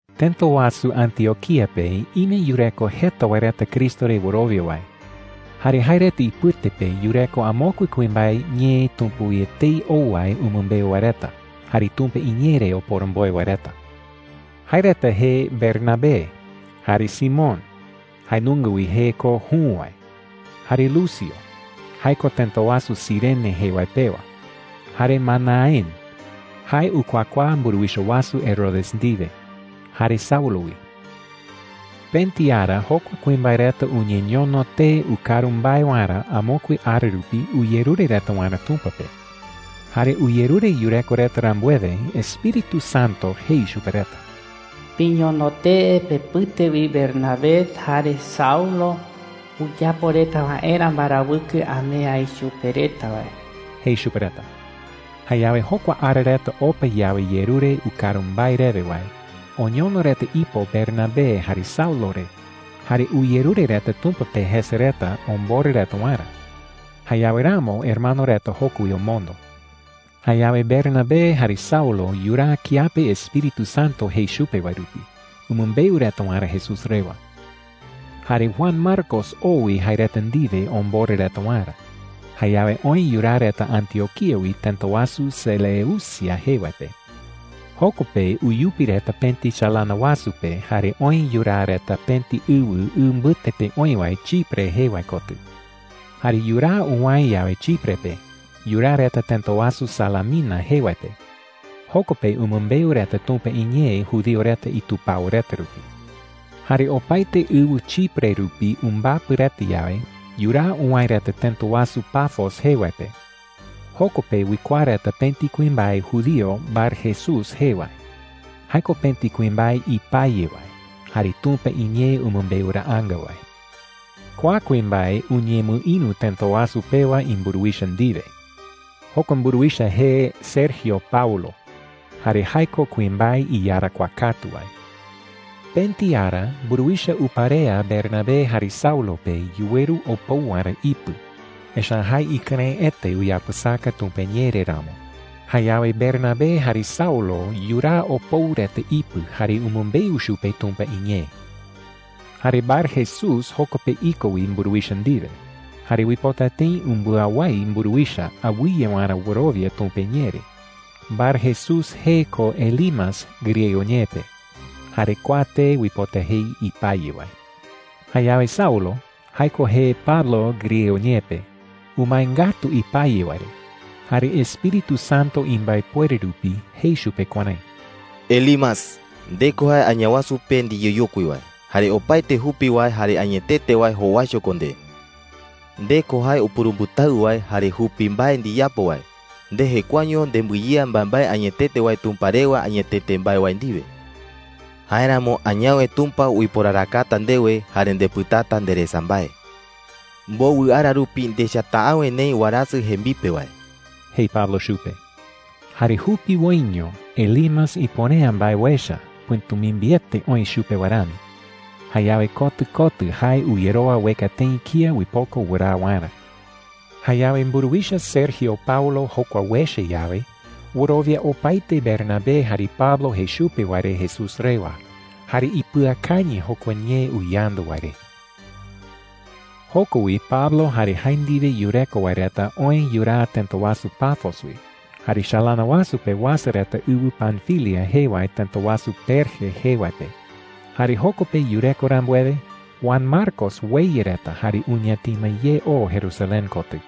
Tëta wasu Antioquía pe ime yureko jeta wae reta Cristo re wɨrowia wae. Jare jae reta ipɨte pe yureko amokue kuimbae ñee Tumpa wi etei ou wae umɨmbeu wae reta jare Tumpa iñee re oporomboe wae reta. Jae reta jee Bernabé, jare Simón (jae nunga wi jee ko Jü wae), jare Lucio (jae ko tëta wasu Cirene jee wae pewa), jare Manaén (jae ukuakuaa mburuwicha wasu Herodes ndiwe), jare Saulo wi. Pëti ara jokua kuimbae reta uñeñono tee ukaru mbae waerä amokue ara rupi uyerure reta waerä Tumpa pe. Jare uyerure yureko reta rambuewe, Espíritu Santo jei chupe reta: “Piñono tee pepɨte wi Bernabé jare Saulo uyapo reta waerä mbarawɨkɨ amee aï chupe reta wae,” jei chupe reta. Jayawe jokua ara reta opa yawe yerure ukaru mbae rewe wae, oñono reta ipo Bernabé jare Saulo re, jare uyerure reta Tumpa pe jese reta omborɨ reta waerä. Jayawe ramo hermano reta joko wi omondo. Jayawe Bernabé jare Saulo yuraa kiape Espíritu Santo jei chupe wae rupi umɨmbeu reta waerä Jesús rewa. Jare Juan Marcos oo wi jae reta ndiwe omborɨ reta waerä. Jayawe oë yuraa reta Antioquía wi tëta wasu Seleucia jee wae pe. Joko pe uyupi reta pëti chalana wasu pe jare oë yuraa reta pëti ɨwɨ ɨ mbɨte pe oï wae Chipre jee wae kotɨ. Jare yuraa uwäe yawe Chipre pe, yuraa reta tëta wasu Salamina jee wae pe. Joko pe umɨmbeu reta Tumpa iñee judío reta itupao reta rupi. Jare opaete ɨwɨ Chipre rupi umbapɨ reta yawe, yuraa uwäe reta tëta wasu Pafos jee wae pe. Joko pe uikuaa reta pëti kuimbae judío Barjesús jee wae. Jae ko pëti kuimbae ipaye wae jare Tumpa iñee umɨmbeuraanga wae. Kua kuimbae uñemɨïru tëta wasu pewa imburuwicha ndiwe. Jokua mburuwicha jee Sergio Paulo, jare jae ko kuimbae iyarakuaa katu wae. Pëti ara mburuwicha uparea Bernabé jare Saulo pe yuweru opou waerä ipɨ, echa’ä jae ikɨrëɨete uyapɨsaka Tumpa iñee re ramo. Jayawe Bernabé jare Saulo yuraa opou reta ipɨ jare umɨmbeu chupe Tumpa iñee. Jare Barjesús joko pe iko wi mburuwicha ndiwe, jare uipota tëi umbɨawái mburuwicha awɨye waerä wɨrowia Tumpa iñee re. Barjesús jee ko Elimas griego ñee pe, jare kua tee uipota jei ipaye wae. Jayawe Saulo – jae ko jee Pablo griego ñee pe – umae ngatu ipaye wae re. Jare Espíritu Santo imbaepuere rupi jei chupe kuärái: “Elimas, nde ko jae Añawasu pe ndiyeyokui wae, jare opaete jupi wae jare añetete wae jowaicho ko nde,” jei. “Nde ko jae upurumbɨtawɨ wae jare jupi mbae ndiyapo wae. Nde jekuaeño nembɨyea mbaembae añetete wae Tumpa rewa añetete mbae wae ndiwe,” jei chupe. “Jáeramo añawe Tumpa uiporarakata ndewe, jare ndepɨtata nderesa mbae,” jei. “Mbowɨ ara rupi ndechata’äwe neï warasɨ jembipe wae,” jei Pablo chupe. Jare jupiwoiño Elimas ipuere’ä mbae uecha, pɨ̈tumimbiete oï chupe wae rami. Jayawe kotɨ kotɨ jae uyerowa ueka tëi kía uipoko wɨraa waerä. Jayawe mburuwicha Sergio Paulo jokua uecha yawe, wɨrowia opaete Bernabé jare Pablo jei chupe wae re Jesús rewa, jare ipɨakañɨ jokua ñee uyandu wae re. Joko wi Pablo jare jae ndiwe yureko wae reta oë yuraa tëta wasu Pafos wi, jare chalana wasu pe uasa reta ɨwɨ Panfilia jee wae tëta wasu Perge jee wae pe. Jare joko pe yureko rambuewe, Juan Marcos ueya reta jare uñatima ye oo Jerusalén kotɨ.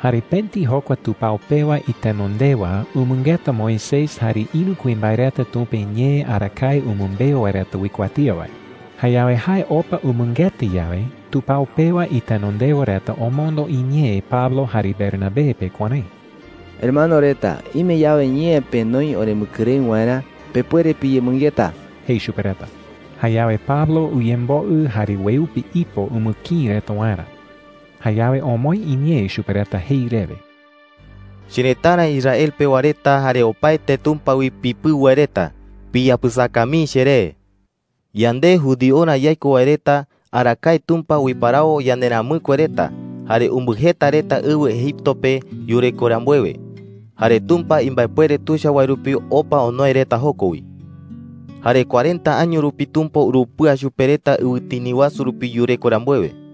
Jare pëti jokua tupao pewa itenondewa umɨngeta Moisés jare ïru kuimbae reta Tumpa iñee arakae umɨmbeu wae reta uikuatía wae. Jayawe jae opa umɨngeta yawe, tupao pewa itenondewa reta omondo iñee Pablo jare Bernabé pe kuärái: “Hermano reta, ime yawe ñee penoi oremɨkɨrëɨ waerä, pepuere piyemɨngeta,” jei chupe reta. Jayawe Pablo uyemboɨ jare ueupi ipo umɨkïi reta waerä. Jayawe omoë iñee chupe reta jei rewe: “Cherëtara Israel pewa reta jare opaete Tumpa wi pipɨu wae reta, piyapɨsaka mii cheré,” jei chupe reta. “Yande judiorä yaiko wae reta, arakae Tumpa uiparawo yanderamɨkue reta, jare umbɨjeta reta ɨwɨ Egipto pe yureko rambuewe. Jare Tumpa imbaepuere tuicha wae rupi opa onoe reta joko wi,” jei Pablo. “Jare cuarenta año rupi Tumpa urupɨa chupe reta ɨwɨtini wasu rupi yureko rambuewe,” jei.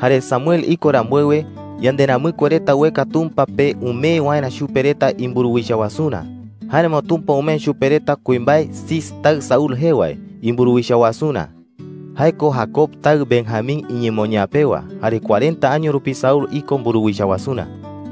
“Jare Samuel iko rambuewe, yanderamɨkue reta ueka Tumpa pe umee waerä chupe reta imburuwicha wasurä. Jáeramo Tumpa umee chupe reta kuimbae Cis taɨ Saúl jee wae imburuwicha wasurä. Jae ko Jacob taɨ Benjamín iñemoñaa pewa. Jare cuarenta año rupi Saúl iko mburuwicha wasurä,” jei.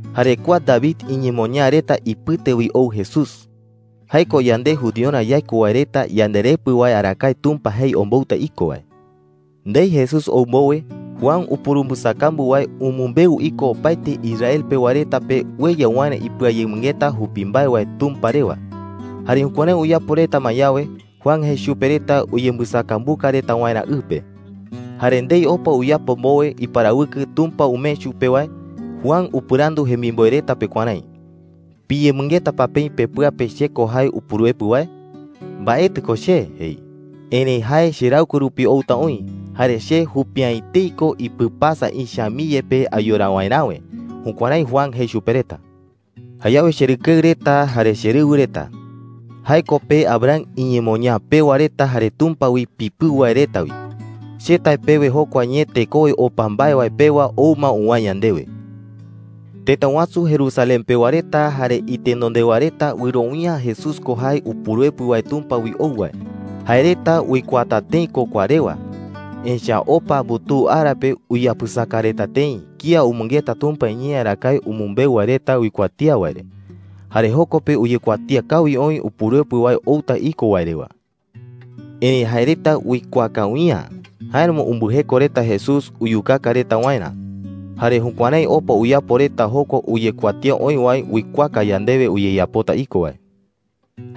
Jare kua David iñemoñaa reta ipɨte wi ou Jesús. Jae ko yande judiorä yaiko wae reta yandeRepɨ wae arakae Tumpa jei ombouta iko wae,” jei Pablo chupe reta. “Ndei Jesús ou mbowe, Juan upurumbɨsakambu wae umɨmbeu iko opaete Israel pewa reta pe ueya waerä ipɨayemɨngeta jupi mbae wae Tumpa rewa. Jare jukuärái uyapo reta ma yawe, Juan jei chupe reta uyembɨsakambuka reta waerä ɨ pe,” jei. “Jare ndei opa uyapo mbowe iparawɨkɨ Tumpa umee chupe wae, Juan upɨrandu jemimboe reta pe kuärái: “¿Piyemɨngeta pa peï pepɨa pe che ko jae Upuruepɨ wae? Mbaetɨ ko che,’ jei. ‘Erëi jae cheraɨkue rupi outa oï. Jare che jupi’ä etei ko ipɨpasa ïcha mii yepe ayora waeräwe.’ Jukuärái Juan jei chupe reta,” jei. “Jayawe cherɨkeɨ reta jare cherɨwɨ reta – jae ko pe Abraham iñemoñaa pewa reta jare Tumpa wi pipɨu wae reta wi – che tae pewe jokua ñee tekowe opa mbae wae pewa ou ma uwäe yandewe,” jei. “Tëta wasu Jerusalén pewa reta jare itenondewa reta wɨrowia’ä Jesús ko jae Upuruepɨ wae Tumpa wi ou wae. Jae reta uikuaata tëi ko kua rewa. Echa’ä opa mbutuu ara pe uyapɨsaka reta tëi kía umɨngeta Tumpa iñee arakae umɨmbeu wae reta uikuatía wae re. Jare joko pe uyekuatía kawi oï Upuruepɨ wae outa iko wae rewa,” jei. “Erëi jae reta uikuaa kawi’ä. Jáeramo umbɨjeko reta Jesús uyukaka reta waerä. Jare jukuärái opa uyapo reta jokua uyekuatía oï wae uikuaaka yandewe uyeyapota iko wae,” jei.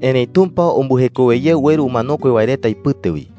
“¡Erëi Tumpa umbɨjekowe ye ueru umanokue wae reta ipɨte wi!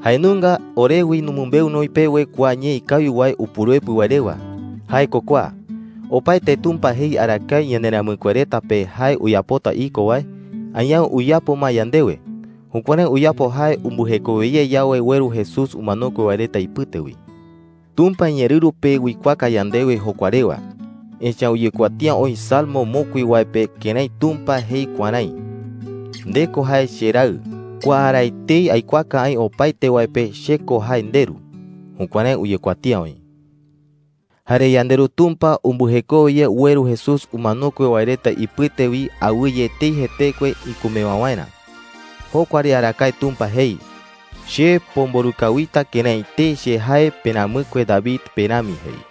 “Jae nunga ore wi numɨmbeu noï pewe kua ñee ikawi wae Upuruepɨ wae rewa. Jae ko kua: Opaete Tumpa jei arakae yanderamɨkue reta pe jae uyapota iko wae, añawe uyapo ma yandewe. Jukuärái uyapo jae umbɨjekowe ye yawe ueru Jesús umanokue wae reta ipɨte wi,” jei. “Tumpa iñeerɨru pe uikuaaka yandewe jokua rewa, echa’ä uyekuatía oï salmo mokui wae pe kërái Tumpa jei kuärái: ‘Nde ko jae cheRaɨ. Kua ara etei aikuaaka aï opaete wae pe che ko jae ndeRu.’ Jukuärái uyekuatía oï,” jei. “Jare yandeRu Tumpa umbɨjekowe ye ueru Jesús umanokue wae reta ipɨte wi awɨye etei jetekue ikumewa waerä. Jokua re arakae Tumpa jei: ‘Che pomborɨ kawita kërái etei che jae peramɨkue David pe rami,’ jei.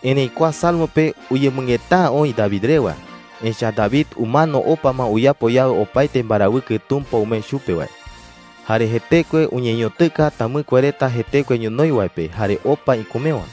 “Erëi kua salmo pe uyemɨngeta’ä oï David rewa. Echa’ä David umano opa ma uyapo yawe opaete mbarawɨkɨ Tumpa umee chupe wae. Jare jetekue uñeñotɨka tamɨkue reta jetekue ñonoï wae pe jare opa ikumewa.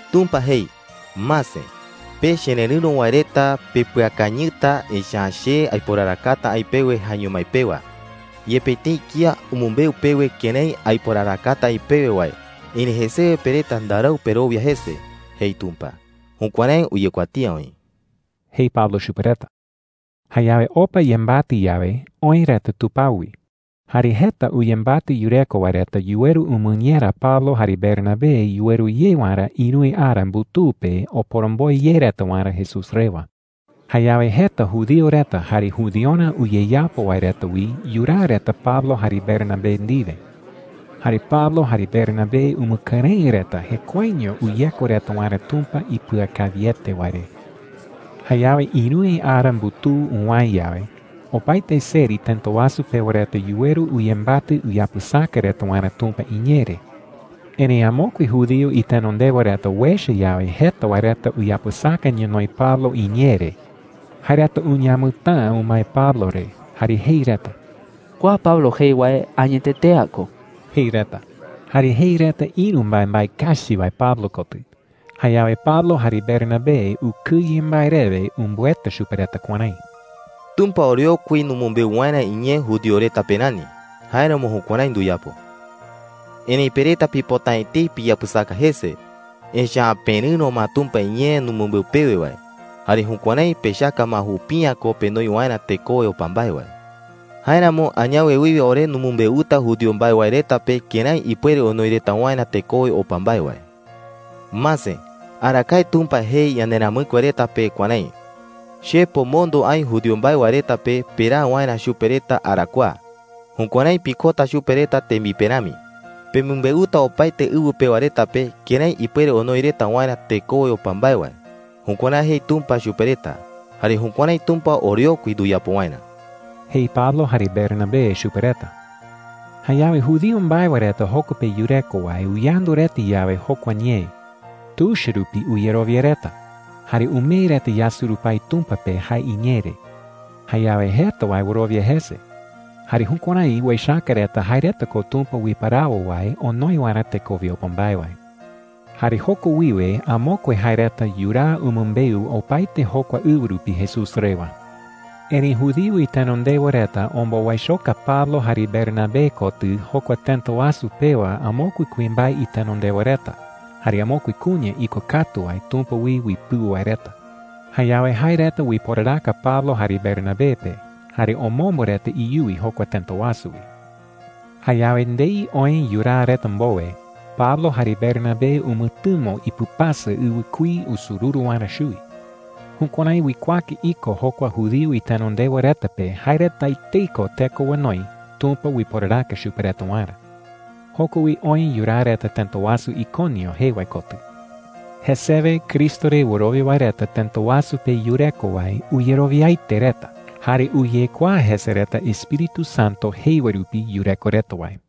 ‘Tumpa jei: ‘Mase, pe chererɨ̈ro wae reta pepɨakañɨta, echa’ä che aiporarakata aï pewe jaeño mái pewa. Yepe tëi kía umɨmbeu pewe kërái aiporarakata aï pewe wae, erëi jesewe pe reta ndarau perowia jese,’ jei Tumpa.’ Jukuärái uyekuatía oï,” jei Pablo chupe reta. Jayawe opa yembatɨ yawe, oë reta tupao wi. Jare jeta uyembatɨ yureko wae reta yuweru umɨñera Pablo jare Bernabé yuweru ye waerä ïruwe ara mbutuu pe oporomboe ye reta waerä Jesús rewa. Jayawe jeta judío reta jare judiorä uyeyapo wae reta wi yuraa reta Pablo jare Bernabé ndiwe. Jare Pablo jare Bernabé umɨkɨrëɨ reta jekuaeño uyeko reta waerä Tumpa ipɨakawiete wae re. Jayawe ïruwe ara mbutuu uwäe yawe, opaete seri tëta wasu pewa reta yuweru uyembatɨ uyapɨsaka reta waerä Tumpa iñee re. Erëi amokue judío itenondewa reta uecha yawe jeta wae reta uyapɨsaka ñonoï Pablo iñee re, jae reta uñamɨtäa umae Pablo re jare jei reta: “Kua Pablo jei wae añetete’ä ko,” jei reta. Jare jei reta ïru mbaembae kachi wae Pablo kotɨ. Jayawe Pablo jare Bernabé ukɨye mbae rewe umbɨeta chupe reta kuärái: “Tumpa oreokui numɨmbeu waerä iñee judío reta pe rani; jáeramo jukuärái nduyapo,” jei reta. “Erëi pe reta pipota’ä etei piyapɨsaka jese. Echa’ä perɨ̈ro ma Tumpa iñee numɨmbeu pewe wae. Jare jukuärái pechaka ma jupi’ä ko penoi waerä tekowe opa mbae wae,” jei reta. “Jáeramo añawe wiwe ore numɨmbeuta judío mbae wae reta pe kërái ipuere onoi reta waerä tekowe opa mbae wae,” jei reta. “Mase, arakae Tumpa jei yanderamɨkue reta pe kuärái: ‘Che pomondo aï judío mbae wae reta pe peraa waerä chupe reta arakuaa. Jukuärái pikota chupe reta tembipe rami. Pemɨmbeuta opaete ɨwɨ pewa reta pe kërái ipuere onoi reta waerä tekowe opa mbae wae.’ Jukuärái jei Tumpa chupe reta, jare jukuärái Tumpa oreokui nduyapo waerä,” jei Pablo jare Bernabé chupe reta. Jayawe judío mbae wae reta joko pe yureko wae uyandu reta yawe jokua ñee, tuicha rupi uyerowia reta, jare umee reta yasurupái Tumpa pe jae iñee re. Jayawe jeta wae wɨrowia jese. Jare jukuärái uechaka reta jae reta ko Tumpa uiparawo wae onoi waerä tekowe opa mbae wae. Jare joko wiwe amokue jae reta yuraa umɨmbeu opaete jokua ɨwɨ rupi Jesús rewa. Erëi judío itenondewa reta ombowaichoka Pablo jare Bernabé kotɨ jokua tëta wasu pewa amokue kuimbae itenondewa reta jare amokue kuña ikokatu wae Tumpa wi uipɨu wae reta. Jayawe jae reta uiporaraka Pablo jare Bernabé pe, jare omombo reta iyuwi jokua tëta wasu wi. Jayawe ndei oë yuraa reta mbowe, Pablo jare Bernabé umɨtɨmo ipɨpasa ɨwɨkuí usururu waerä chuwi. Jukuärái uikuaaka iko jokua judío itenondewa reta pe jae reta etei ko teko onoi Tumpa uiporaraka chupe reta waerä. Joko wi oë yuraa reta tëta wasu Iconio jee wae kotɨ. Jesewe Cristo re wɨrowia wae reta tëta wasu pe yureko wae uyerowiaete reta. Jare uyekuaa jese reta Espíritu Santo jei wae rupi yureko reta wae.